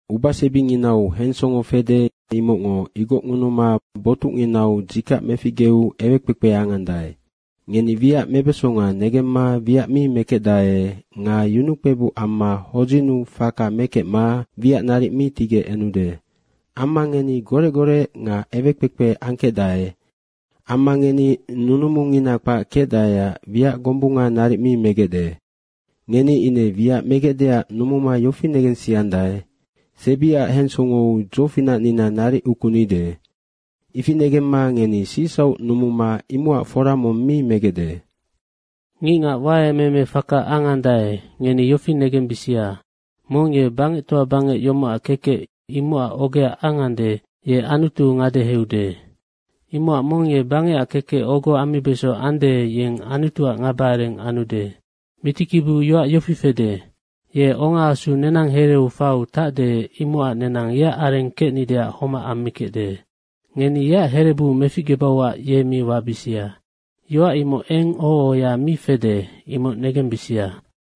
Ubasebinginau hensongo fede, imocngo igocngunuma botucnginau dzikac meficgeu ewekpekpe angandae. Ngeni wiac mebesonga negemma wiac mi mekecdae nga yunukpebuc amma hodzinnu faka mekecma wiac naric mi tigec enude. Amma ngeni gorec gorec nga ewekpekpe angkecdae. Amma ngeni nunumungina kpac kecdaeac wiac gombunga naric mi megecde. Ngeni ine wiac megecdeac numuma yofi negensiandae, “Sebiac hensongou dzofinacnina naric ukunide.” Ifi negemma ngeni sicsauc numuma imocac fora mong mi megecde. Ngicngac waemeeme faka angandae, ngeni yofi negembisia, mong ye bangectoa bangec yomocac kekec imocac ogea angande, ye Anutu ngadeheude. Imocac mong ye bangecac kekec ogo ammibeso ande, yeng Anutuac ngaba areng anude. Mitikibiu yoac yofi fede, “Ye ongaasu nenang hereu faiu tacde, imocac nenang yeac areng kecnideac homac ammikecde. Ngeni yeac herebu meficgebauac ye mi wabisia.” Yoac imoc eng oho ohoya mi fede, imoc negembisia.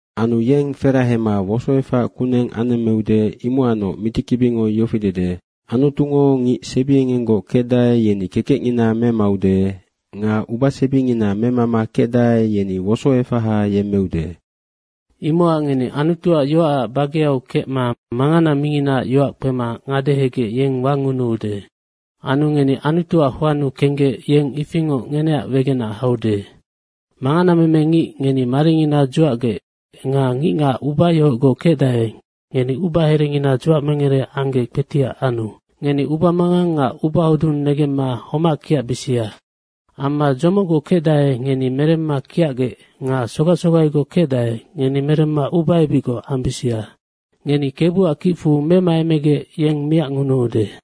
Anu yeng ferahema wosoefac kuneng anemmeude, imocacnoc mitikibingo yofi dede, “Anutungo ngic sebiengenggoc kecdae, yeni kekecngina memaude nga ubasebingina memama kecdae, yeni wosoefaha yemmeude.” Imocac ngeni Anutuac yoacac bageau kecma mangana minginaac yoac kpema ngadehegec yeng wangunuude. Anu ngeni Anutuac hoannu kenggec yeng ifingoc ngeneac wegenac haude. Manganameme ngic, ngeni maringina dzuacgec nga ngicngac ubayohocgoc kecdae, ngeni ubaherengina dzuacmengere anggec kpetiac anu. Ngeni ubamangang nga ubahodung negemma homac kiacbisia amma dzomocgoc kecdae, ngeni meremma kiacgec nga sogac sogaigoc kecdae, ngeni meremma ubaebicgoc ambisia. Ngeni Kebuac kicfu memaemegec yeng miacngunuude.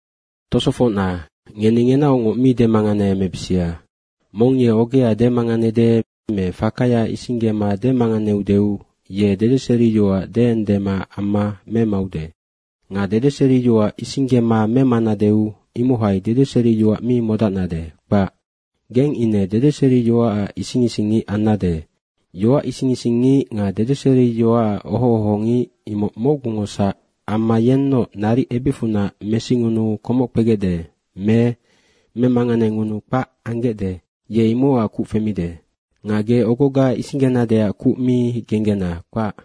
Tosofocna, ngeni ngenaocngoc mi demanganeemebisia. Mong ye ogea demanganede me fakaya isinggema demanganeudeu ye dedeseriyoac deendema amma memaude. Nga dedeseriyoac isinggema memanadeu imohai dedeseriyoac mi modacnade, kpac. Geng ine dedeseriyoacac ising ising ngic annade. Yoac ising isingngic nga dedeseriyoacac oho ohongic imoc mocgungosac amma yennoc naric ebicfunac mesingunuu komoc kpegecde me memanganengunuu kpac anggecde, ye imocac kuc femide. Nga ge ogoga isinggenadeac kuc mi genggena, kpac.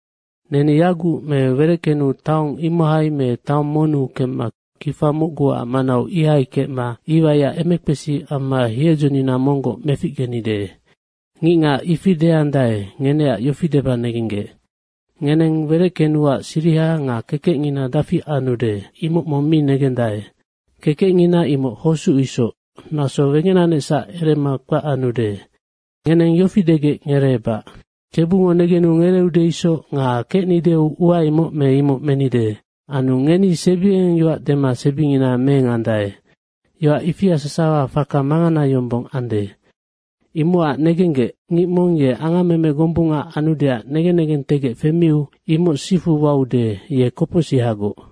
“Neni yaguc me wereckenu taong imohai me taong monnu kemma kifa mocguac manau ihai kecma iwaiac emekpesi amma hiedzonina monggoc meficgenide.” ngicngac ifi deandae, ngeneac yofi deba negenggec, Ngeneng wereckenuac siriha nga kekecngina dafi anude, imoc mong mi negendae. Kekecngina imoc hosuc isoc, naso wegenanecsac erema kpac anude. Ngeneng yofi degec ngereebac, “Kebungo negenu ngereeude isoc nga kecnideu ua imoc me imoc menide.” Anu ngeni sebiengeng yoac dema sebingina meengandae. Yoac ifia sasawa faka mangana yombong ande. Imocac negenggec, ngic mong ye angammeme gombunga anudeac negen negengtegec femiu imoc sifu waude, ye kopocsihagoc.